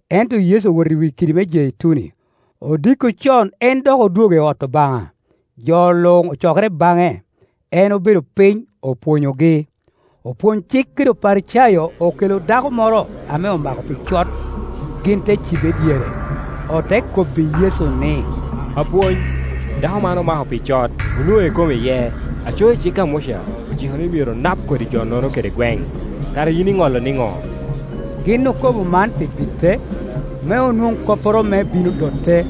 Ento Yecu owoto i wi kidi me Jeituni. Odiko con en dok odwogo i ot Obaŋa; jo luŋ ocokere baŋe, en obedo piny, opwonyogi. Opwony-cik kede Oparicayo okelo dako moro ame omako pi cot. Gin te cibe i dyere, ote kobbi Yecu ni, “Apwony, dako man omako pi cot, onwoŋe kom iye. Aco i cik Muca ociko ni myero onap kodi jo-nono kede gweŋ. Kara yin iŋolo nino?” Gin okobo man pi bite, me onwoŋ kopporo me bino dote.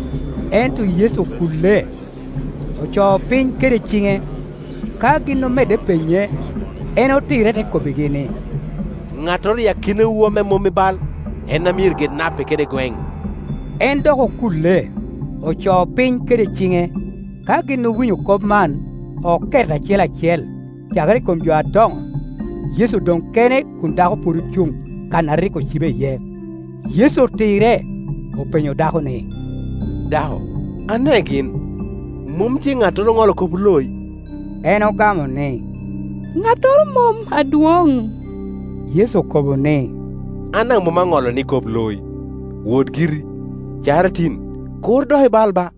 Ento Yecu okulle, ocoo piny kede ciŋe. Ka gin omedde penye, en otirre te kobbigi ni, “Ŋattoro i akinawu ame mom i bai en amyero ge nape kede gweŋ.” En dok okulle, ocoo piny kede ciŋe. Ka gin owinyo kop man, oket acel acel, cakere i kom jo adoŋo; Yecu oloŋ kene kun dako pwod ocuŋ kan a rik ocibe iye. Yecu otirre, openyo dako ni, “Dako, ane gin? Mom tye ŋattoro oŋolo kop oloi?” En ogamo ni, “Ŋattoro mom, adwoŋ.” Yecu okobo ni, “An daŋ mom aŋolo ni kop loi. Wot giri; cakere tin kur dok ibal ba.”]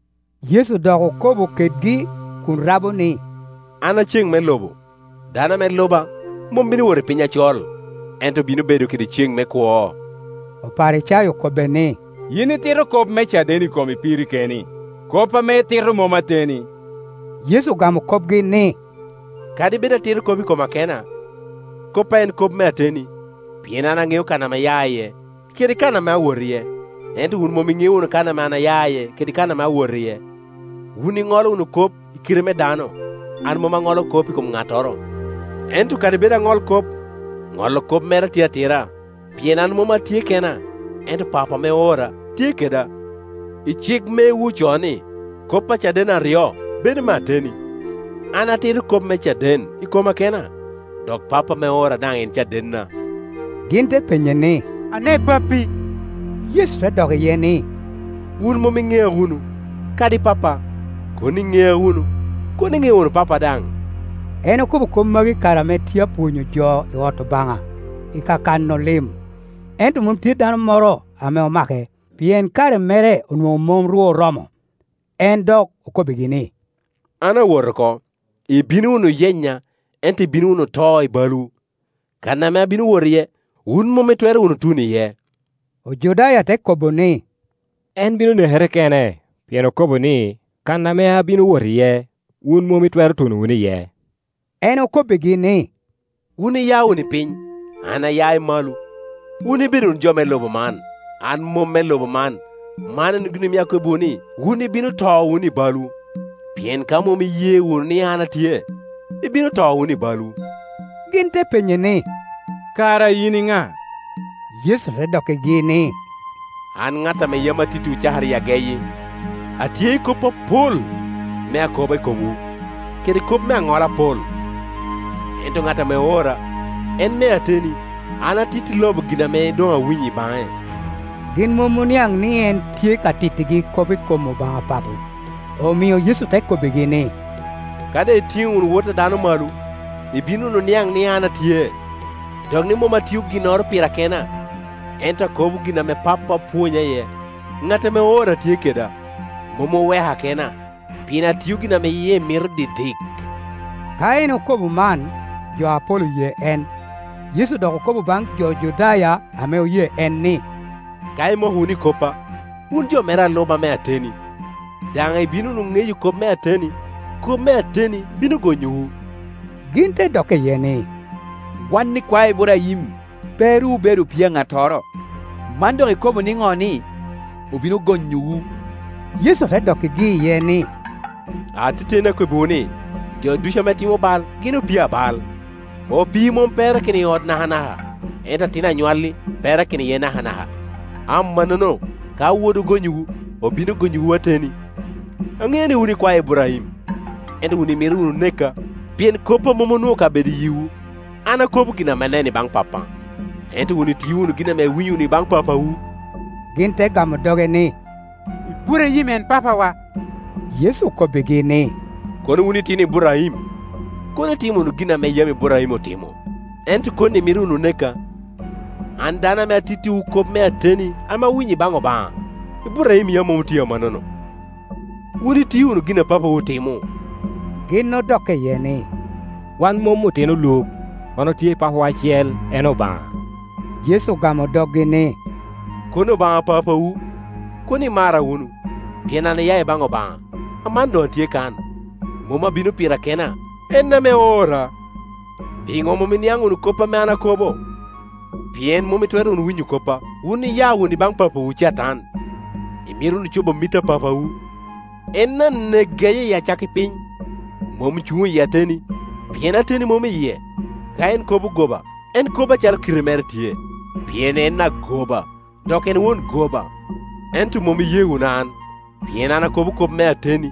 Yecu dok okobo kedgi kun rabo ni, “An a ceŋ me lobo; dano ame luba mom bino wot i piny acol, ento bino bedo kede ceŋ me kwo.” Oparicayo okobbe ni, “Yin itito kop me caden i komi piri keni; kop ame itito mom ateni.” Yecu ogamo kopgi ni, “Kadi bed atito kop i koma kena, koppa en kop me ateni, pien an aŋeo kan ame aya iye, kede kan ame awot iye, ento wun mom iŋeo wunu kan ame aya iye kede kan ame awot iye. Wun iŋolo wunu kop i kite me dano, an mom aŋolo kop i kom ŋattoro. Ento kadi bed aŋolo kop, ŋolo kop mera tye atira, pien an mom atye kena. Ento Papo ame oora tye keda. I cik mewu ocoo ni, ‘Kop a caden aryo bedo me ateni.’ An atito kop me caden i koma kena, dok Pappa ame oora daŋ en cadenna.” Gin te penye ni, “Ane Pappi?” Yecu te dok iye ni, “Wun mom iŋea wunu, kadi Pappa. Kono iŋea wunu, kono iŋeo wunu Pappa daŋ.” En okobo kop magi i kare ame tye apwonyo jo i ot Obaŋa i ka kano lim, ento mom tye dano moro ame omake, pien kare mere onwoŋo mom ru oromo. En dok okobbigi ni, “An awot oko; ibino wunu yenya, ento ibino wunu to i balwu. Kan ame abino wot iye, wun mom itwero wunu tuno iye.” Ojudaya te kobo ni, “En bino nekere kene, pien okobo ni, ‘Kan ame abino wot iye, wun mom itwero tuno wunu iye?’” En okobbigi ni, “Wun iya wunu i piny; an aya i malo. Wun ibedo wunu jo me lobo man, an mom me lobo man. Man en gin omio akobbiwu ni, wun ibino to wunu i balwu, pien ka mom iye wunu ni an atye, ibino to wunu i balwu.” Gin te penye ni, “Kara yin i na?” Yecu te dokkigi ni, “An ŋat ame yam atittiwu cakere i ageyi. Atye i kop apol me akoba i komwu, kede kop me aŋola apol; ento ŋat ame oora en me ateni, an atitti lobo gin ame doŋ awinyo i baŋe.” Gin mom oniaŋ ni en tye ka tittigi kop i kom Obaŋa Papo. Omio Yecu te kobbigi ni, “Ka doŋ itiŋo wunu Wot a dano malo, ibino wunu niaŋ ni an atye, dok ni mom atio ginnoro pira kena, ento akobo gin ame Pappa opwonya iye. Ŋat ame oora tye keda; mom oweka kena, pien atio gin ame yie mito didik.” Ka en okobo man, jo apol oye en. Yecu dok okobo baŋ jo Judaya ame oye en ni, “Ka imoko wunu i koppa, wun jo mera a luba me ateni, daŋ ibino wunu ŋeyo kop me ateni, kop me ateni bino gonyowu.” Gin te dokke iye ni, “Wan ikwae Iburaim, pe ru obedo opii a ŋattoro. Man dok ikobo niŋo ni, ‘Obino gonyowu?’” Yecu te dokkigi iye ni, “Ateteni akobbiwu ni, jo ducu ame timo bai, gin opii abal. Opi i mom perakino i ot nakana ka, ento atin anywalli perakino iye nakanaka. Amannono ka Wod ogonyowu, obino gonyowu ateni. Aŋeo ni wun ikwae Iburaim; ento wun imito wunu neka, pien koppa mom onwoŋo kabedo i yiwu. An akobo gin ame aneno i baŋ Pappa, ento wun itio wunu gin ame iwinyo i baŋ papawu.” Gin te gamo doge ni, “Iburaim en papawa.” Yecu okobbigi ni, “Kono wun itino Iburaim, kono itimo wunu gin ame yam Iburaim otimo. Ento koni imito wunu neka, an dano ame atittiwu kop me ateni ame awinyo i baŋ Obaŋa; Iburaim yam mom otio amannono. Wun itio wunu gin ame papawu timo.” Gin odokke iye ni, “Wan mom otino luk; wan otye i papawa acel, en Obaŋa.” Yecu ogamo doggi ni, “Kono Obaŋa papawu, kono imara wunu, pien an aya i baŋ Obaŋa, aman doŋ atye kan; mom abino pira kena, en ame oora. Piŋo mom iniaŋ wunu kop ame an akobo? Pien mom itwero wunu winyo koppa. Wun iya wunu i baŋ papawu Catan, imito wunu co bo mit a papawu. En anek geye i acakki piny, mom cuŋ i ateni, pien ateni mom i yie. Ka en kobo goba, en kobo acalo kite mere tye, pien en agoba, dok en won goba. Ento mom iye wunu an, pien an akobo kop me ateni,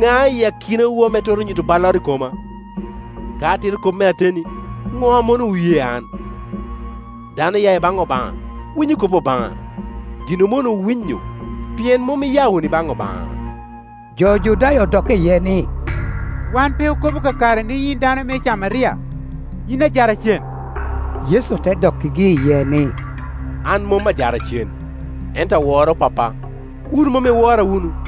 ŋa i akinawu ame twero nyu to balloro i koma? Ka atito kop me ateni, ŋo ame omonowu ye an? Dano oya i baŋ Obaŋa winyo kop Obaŋa; gin omonowu winyo, pien mom iya wunu i baŋ Obaŋa.” Jo Judaya odokke iye ni, “Wan pe okobo kakare ni yin i dano me Camaria, yin ajaracen?” Yecu te dokkigi iye ni, “An mom ajaracen; ento aworo Pappa, wun mom iwora wunu.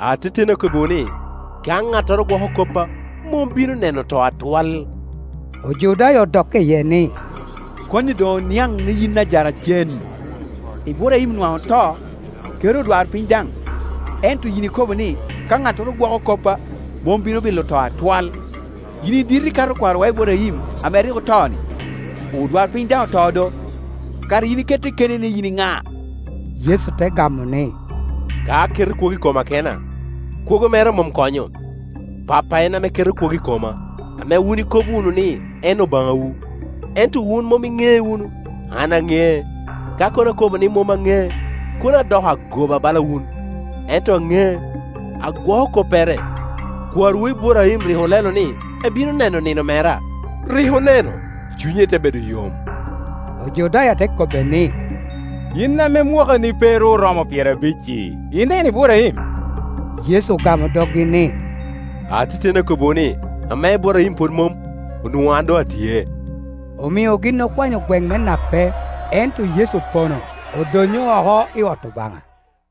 Ateteni akobbiwu ni, ka ŋattoro gwoko koppa, mom bino ne no to atwal.” Ojudaya odokke iye ni, “Koni doŋ oniaŋ ni yin ajaracen. Iburaim nwaŋ oto, kede odwarpiny daŋ; ento yin ikobo ni, ‘Ka ŋattoro gwoko koppa, mom bino bilo to atwal.’ Yin i dit ikato kwarowa Iburaim ame rik oto-ni? Odwarpiny daŋ oto do! Kara yin ikette keni ni yin i ŋa?” Yecu te gamo ni, “Ka aketo kwogo i koma kena, kwogo mera mom konyo; Pappa en ame ke to kwogo i koma, ame wun ikobo wunu ni en Obaŋawu. Ento wun mom iŋee wunu, an aŋee. Ka kono akobo ni mom aŋee, kono adoko agoba bala wun; ento aŋee, agwoko koppere. Kwarowu Iburaim rik olelo ni ebino neno nino mera; rik one no, cunye te bedo yom.” Ojudaya te kobbe ni, “Yin ame mwakani pe ru oromo pyerabic-ci, ineno Iburaim?” Yecu ogamo doggi ni, “Ateteni akobbiwu ni, ame Iburaim pwod mom, onwoŋo an doŋ atye.” Omio gin okwanyo gweŋ me nape; ento Yecu opono, odonyo oko i ot Obaŋa.